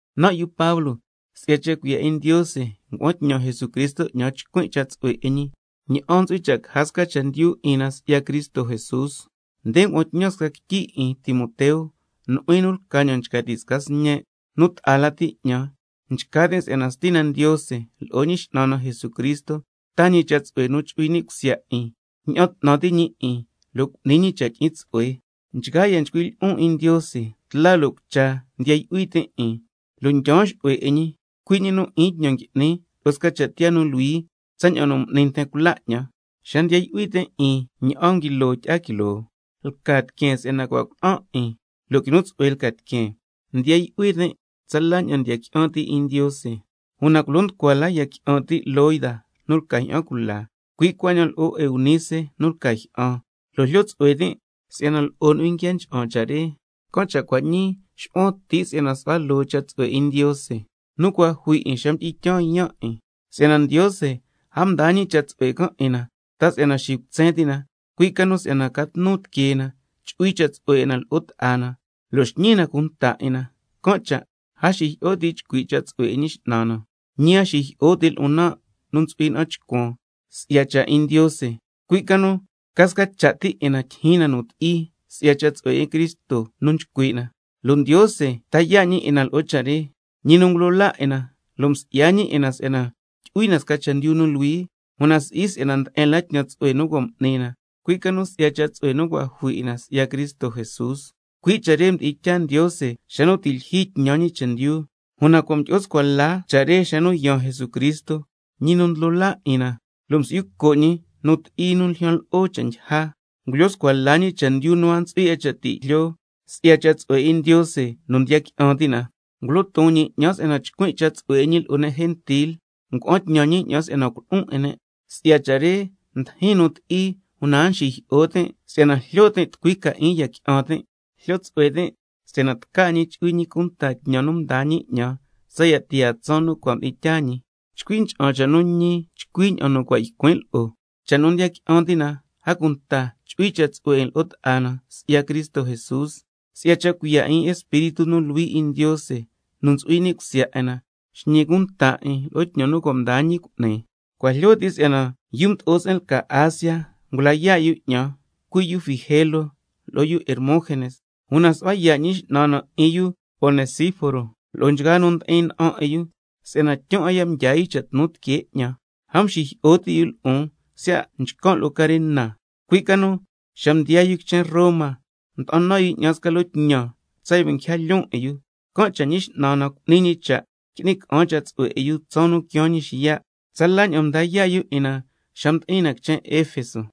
Nan' yu Pablo, si'ya cha' cuiya' 'in Ndiose ngua'an tñan Jesucristo 'ñan tsa ycuin' cha' tsu'hue 'in ñi, ña'an ntsu'hui cha' caja sca chendyu 'in na si'ya Cristo Jesús. Nde ngua'an tñan sca quityi 'in, Timoteo, nu'huin lca ña'an nchca ti' sca sñen' nu ta'a lati 'ñan, nchca tin' si'yana Stina Ndiose lo'o Ñi X'nan na Jesucristo taa ñi cha' tsu'hue nu chu'hui ni' cusya 'in, ña'an 'tnan ti' ñi 'in, lo' cu'ni ñi cha' tyi'in tsu'hue. Nchgaa ya' nchcuin' lyi'on 'in Ndiose tla lo' cucha, ndiya yu'hui tin' 'in, lo' ndyaan xu'hue 'in ñi, cui' ñi nu 'in tñan ngui'nin lo'o sca cha' tiyaa nu luhui, tsaña'an nu m'ni nten cula 'ñan. Xa ndiya yu'hui tin' ña'an nguilo tyi'a quiloo, lca tiqueen si'yana cua' cuna'an 'in lo' quinu tsu'hue lca tiqueen. Ndiya yu'hui tin' tsala ña'an ndiya qui'an ti' 'in Ndiose, una culo nducua lati ya qui'an ti' Loida nu lca jyi'an cula, cui' cuaña'an lo'o Eunice nu lca jyi'an, lo' jlyo tsu'hue tin' si'yana lo'o nu'huin nguia ncha'an cha' re. Can' cha' cua' ñii nxu'huan ti' si'yana su'hua loo cha' tsu'hue 'in Ndiose nu cua' jui 'in xa mdi'in tyaan yaan' 'in. Si'yana Ndiose a mdaa ñi cha' tsu'hue can' 'in na, ta si'yana xicutsen ti' na, cui' ca nu si'yana ca tnu tiquee na, chu'hui cha' tsu'hue 'in na lo'o nten, lo' xñi na cunta 'in na. Can' cha' a xijyi'o ti' chcui' cha' tsu'hue 'in Ñi X'nan na, ñi a xijyi'o ti' lo'on ña'an nu ntsu'huin na'an chcuan si'ya cha' 'in Ndiose, cui' ca nu ca sca cha' ti 'in na tyijyin na nu ti'i si'ya cha' tsu'hue 'in Cristo nu nchcui' na, lo' Ndiose ta yaa' ñi 'in na lo'o cha' re, ñi nu ngulo laa 'in na, msi'ya ñi 'in na si'yana tyu'hui na sca chendyu nu luhui, una si'i si'yana nde'en la tñan tsu'hue cua' m'ni na, cui' ca nu si'ya cha' tsu'hue nu cua' jui 'in na si'ya Cristo Jesús, cui' cha' re mdi'in tyaa Ndiose xa nu ti' lyijyi tñan ñi chendyu. Una cua' mdyi'o scua la cha' re xa nu yaan Jesucristo, Ñi nu Ndlo laa 'in na, lo' msi'yu co' ñi nu ti'i nu ljyan lo'o cha' ndyija, ngulyo scua la ñi sca chendyu nu a ntsu'hui 'a cha' ti' jlyo, si'ya cha' tsu'hue 'in Ndiose nu ndiya qui'an ti' na. Ngulo ton ñi 'ñan si'yana chcuin' cha' tsu'hue 'in ñi lo'o ne' gentil, ngua'an tñan ñi 'ñan lja ne' si'yana culo'on 'in ne'. Si'ya cha' re ndijin nu ti'i, una a nxijyi'o tin' si'yana jlyo tin' tucui ca 'in ya qui'an tin'. Jlyo tsu'hue tin' si'yana tca 'in ñi chu'hui ñi cunta tñan nu mdaa ñi 'ñan tsaya' tiyaa tsaan nu cua' mdi'in tyaa ñi. Chcui ncha'an cha' nu ñi chcui ña'an nu cua' ycuin' lo'o, cha' nu ndiya qui'an ti' na, a cunta chu'hui cha' tsu'hue 'in lo'o ta'a na si'ya Cristo Jesús. Si'ya cha' cuiya' 'in Espíritu nu Luhui 'in Ndiose nu ntsu'hui ni' cusya 'in na, xñi cunta 'in lo'o tñan nu cua' mdaa ñi cu'ni. Cua' jlyo ti' si'yana yu mdo'o se'en lca Asia ngula yaa' yu 'ñan, cui' yu Figelo lo'o yu Hermógenes. Una su'hua yaa' Ñi X'nan na 'in yu Onesíforo lo'o nchgaa nu ndi'in na'an 'in yu, si'yana tyun 'a ya' mdyaa yu cha' tnu tiquee 'ñan, a mxijyi'o ti' yu lo'on siya' nchcan' lo'o carena, cui' ca nu xa mdiyaa yu quichen Roma mda'an nan yu 'ñan sca loo tñan tsaya' nguija lyoon 'in yu. Can' cha' Ñi X'nan na cu'ni ñi cha' qui'ni ca'an cha' tsu'hue 'in yu tsaan nu quiaan ñi xiya'. Tsala ña'an mda yaa' yu 'in na xa mdi'in na quichen Efeso.